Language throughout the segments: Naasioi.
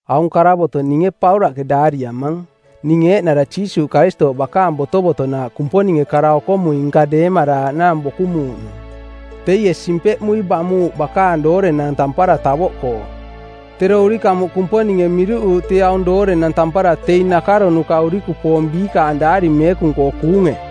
Aung karavoto˜ ninge Paulaꞌke daariamang. Ning eeꞌnara Jiisuuꞌ Karistooꞌ bakaang botovotonaaꞌ Kumponinge kara-okomui-nka deemaraaꞌnaang bokumuuꞌnung. Teie simpeꞌmui bamuuꞌ bakaang doorenang tampara tavoꞌkoo. Tero urikamuꞌ Kumponinge miruꞌuuꞌ tee aung doorenang tampara teing nakaronuka˜ urikupoong biikaang Daari Meekung-koo kuunge.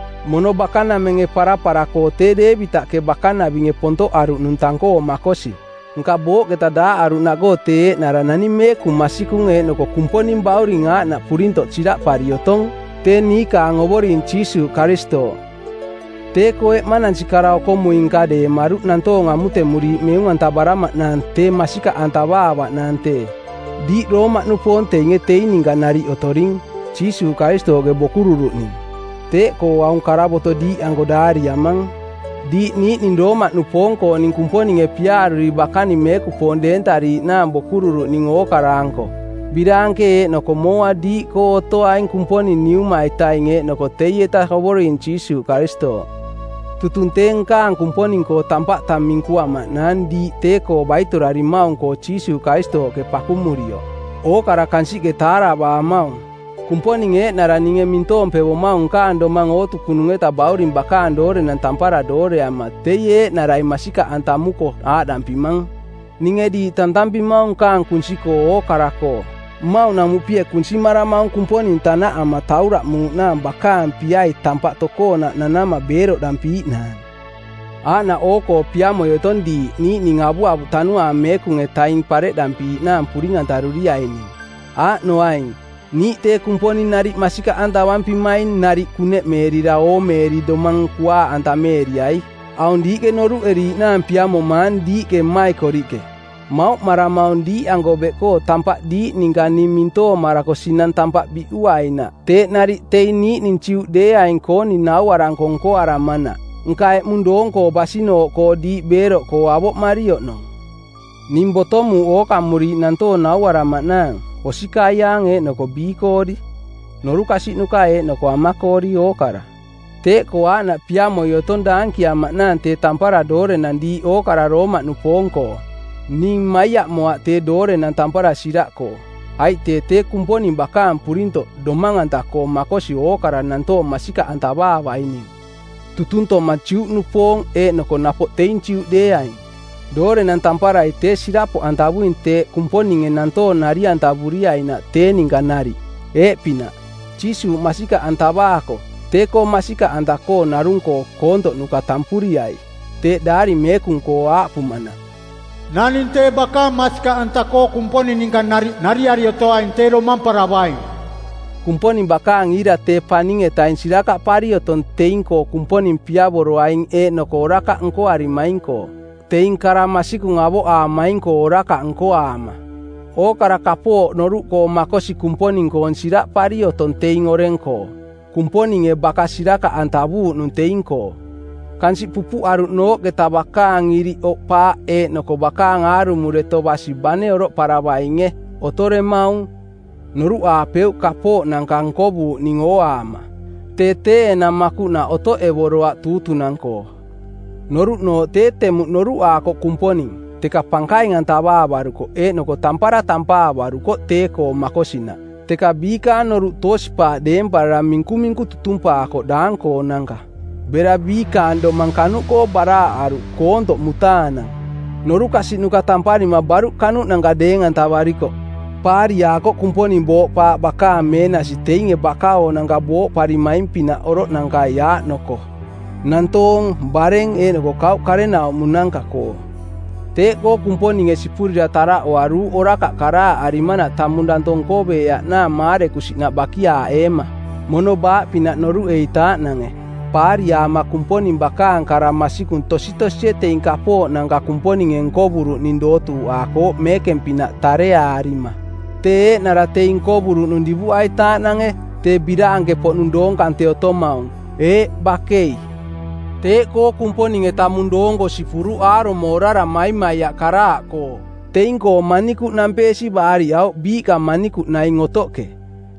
Mono bakanamenge parapara-koo tee Deevitaꞌke bakanavinge pontoꞌaruꞌnung tang-koo makosi, nka booꞌketa daaꞌaruꞌnaꞌkoo tee eeꞌnara naning meekung masikung eeꞌnoko Kumponing Bauring aaꞌnaꞌ purintoꞌ siraꞌpari otong. Tee niikaang Ovoring Jiisuuꞌ Karistooꞌ. Tee-koo eꞌmanansi kara-okomui-nka deemaruꞌ nantoong amutemuriiꞌ meung-antavaramaꞌnaang tee masikaꞌantavaavaꞌnaang tee. Diiꞌ Roomaꞌnupoong teinge teing ninka nariꞌ otoring, Jiisuuꞌ Karistooꞌke bokururuꞌning. Teeꞌkoo aung karavoto diiꞌanko daariamang, diiꞌ niiꞌning Roomaꞌnupoong-kooning Kumponinge piaaruri bakaning meekupoong deentariiꞌnaang bokururuꞌning ookara-anko. Biraanke eeꞌnoko mooa diiꞌkoo otoaing Kumponing Niuma-itaing eeꞌnoko teieta Ovoring Jiisuuꞌ Karistooꞌ. Tutung tee nkaang Kumponing-koo tampaꞌ tang minkuamaꞌnaang diiꞌ tee-koo baitorarimaung-koo Jiisuuꞌ Karistooꞌke pakumurioꞌ. Ookara kansiꞌke taaravaamaung. Kumponing eeꞌnara ninge mintoompevomaung nkaang domang ootukununge Bauring bakaang doorenang tampara doorearama teie eeꞌnarai masikaꞌantamuko aaꞌdampimang: Ninge diiꞌ tantampimaung nkaang kunsi-koo ookara-koo. Mmauꞌnamuꞌpie kunsimaramaung Kumponing tanaꞌama tauraꞌmuuꞌnaang bakaang piai tampaꞌ tokoonaꞌ nanama beeroꞌdampiiꞌnaang. Aaꞌnaꞌ oo-koo piamoi otong diiꞌ niiꞌning avuavuꞌ Tanuaang Meekung-etaing pareꞌdampiiꞌnaang puring-antaruriaining. Aaꞌnoaing: niiꞌ tee Kumponing nariꞌ masikaꞌantavampimaing nariꞌ kuneꞌmeerira oomeeri domang kuaaꞌantameeriai. Aung diiꞌke noruꞌeriiꞌnaang piamomaang diiꞌke mmaikoriꞌke: Mauꞌmaramaung diiꞌanko beꞌkoo tampaꞌ diiꞌ ninka ning mintoomarako sinang tampaꞌ biꞌuainaꞌ teeꞌ nariꞌ teing niiꞌning Juꞌdeeaing-kooning nauaranko nkoaramanaꞌ, nka eꞌmung doong-koo basinooꞌkoo diiꞌ beeroꞌkoo avoꞌmari oꞌnong. Ning botomuuꞌ ookamuriiꞌ nantoong nauaramaꞌnaang, osikaiaang eeꞌnoko biikoori, norukasiꞌnuka eeꞌnoko amakoori, ookara. Teeꞌkoo aaꞌnaꞌ piamoi otong daankiamaꞌnaang tee tampara doorenang diiꞌ ookara Roomaꞌnupoong-koo. Ning maiaꞌmoaꞌ tee doorenang tampara siraꞌkoo. Aiꞌ tee tee Kumponing bakaang purintoꞌ domang-anta-koo makosi ookara nantoong masikaꞌantavaavaining, tutuntoma Juꞌnupoong eeꞌnoko napoꞌ teing Juꞌdeeaing. Doorenang tamparai tee sirapoꞌantavuing teeꞌ Kumponinge nantoong nari-antavuriainaꞌ tee ninka nariꞌ. Eeꞌpinaꞌ: Jiisuuꞌ masikaꞌantavaako, tee-koo masikaꞌanta-koo narung-koo koontoꞌnuka tampuriai. Teeꞌ Daari Meekung-koo aaꞌpumanaꞌ, “Naning tee bakaang masikaꞌanta-koo Kumponing ninka nariꞌ nariari otoaing tee domamparavaing.” Kumponing bakaang iira tee paning-etaing sirakaꞌpari otong teing-koo Kumponing piavoroaing eeꞌnoko orakaꞌ nkoarimaing-koo, teing kara masikung avoꞌaamaing-koo orakaꞌ nkoaama. Ookara kapooꞌ noruꞌkoo makosi Kumponing-koong siraꞌpari otong teing oreng-koo. Kumponinge baka sirakaꞌantavuuꞌnung teing-koo. Kansiꞌ pupuꞌaruꞌnooꞌketa bakaang iriꞌ oꞌpaaꞌ eeꞌnoko bakaang aarumo deto basi bane oroꞌparavainge, otoremaung. Noruꞌaapeuꞌ kapooꞌnanka nkovuuꞌning ooaama. Tee tee enang makuꞌnaꞌ otoꞌevoroaꞌ tuutunang˜koo. Noruꞌnooꞌ tee temuꞌ noruꞌaakoꞌ Kumponing, teka pankaing-antavaavarukoꞌ eeꞌnoko tampara tampaavarukoꞌ tee-koo makosinaꞌ. Teka biikaang noruꞌ toosi-paaꞌ deemparara minkuminku tutumpaakoꞌ daang-koonanka. Bera biikaang domang kanuꞌkoo baraaꞌaruꞌ koontoꞌ mutaanang. Norukasiꞌnuka tamparima baruꞌ kanuꞌnanka deeng-antavarikoꞌ. Paariaakoꞌ Kumponing booꞌpaaꞌ bakaang meenasi teinge baka-oonanka booromaing-pinaꞌ oroꞌnankai aaꞌning-koo: nantoong, bareng, eeꞌnoko kauꞌ karenaumonanka-koo. Teeꞌkoo Kumponinge sipurira taraꞌoaruuꞌ orakaꞌ karaaꞌarimanaꞌ tamung danto nkoveeaꞌnaang maarekusinaꞌ bakiaaꞌeema, mono baaꞌpinaꞌ noruꞌeitaaꞌnange. Paariaama Kumponing bakaang kara masikung tositosie teing kapooꞌnanka Kumponinge nkovuruꞌning dootuuꞌaakooꞌ meekeng-pinaꞌ tareaarima, tee eeꞌnara teing nkovuruꞌnung divuꞌaitaaꞌnange, tee biraanke-poꞌnung doong kante otomaung. Eeꞌ, bakei! Teeꞌkoo Kumponinge tamung doong-koo sipuruꞌ aarumo orara maimaiaꞌ karaaꞌkoo. Teing-koo manikuꞌ nampeesi baariꞌauꞌ biiꞌka manikuꞌ naing otoꞌke.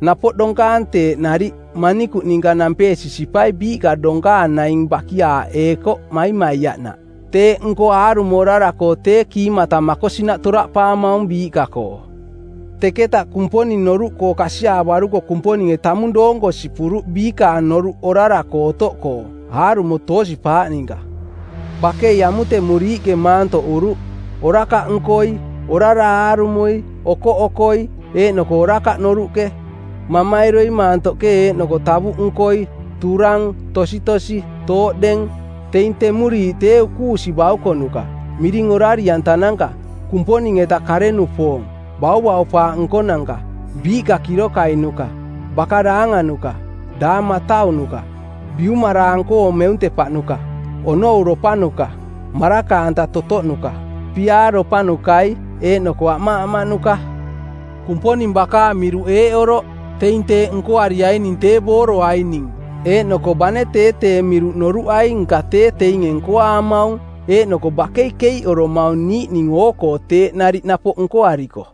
Napoꞌ donkaang teeꞌ nariꞌ, manikuꞌ ninka nampeesi sipai biiꞌka donkaang naing bakiaaꞌeekoꞌ maimaiaꞌnaꞌ. Teeꞌnko aarumo orara-koo tee kiimata makosinaꞌ toraꞌpaamaung biiꞌka-koo. Teketaꞌ Kumponing noruꞌkoo kasiaavaruko Kumponinge tamung doonko sipuruꞌ biikaang noruꞌ orara-koo otoꞌkoo, aarumo toosi-paaꞌ ninka. Bakei amutemuriiꞌke maantoꞌuruꞌ, orakaꞌnkoi, orara aarumoi, okoꞌokoi, eeꞌnoko orakaꞌ noruꞌke. Mamairoi maantoꞌke eeꞌnoko tavuꞌnkoi, turang, tositosi, tooꞌdeng; Teing temuriiꞌ tee ukuusi baukonuka, miring orari-antananka, Kumponing-eta kare-nupoong, bauvaupaaꞌ nkonanka, biiꞌka kirokai-nuka, baka daanganuka, daang mataunuka, biumaraang-koo meuntepaꞌnuka, onouropanuka, maraka-anta totoꞌnuka, piaaropanukai, eeꞌnoko amaꞌamaꞌnuka. Kumponing bakaang miruꞌ eeꞌ oroꞌ: Teing teeꞌ nkoariaining tee booroaining. Eeꞌnoko bane tee tee miruꞌ noruꞌai nka tee teinge nkoaamaung, eeꞌnoko bakei keiꞌoromaung niiꞌning oo-koo teeꞌ nariꞌ napoꞌ nkoariko.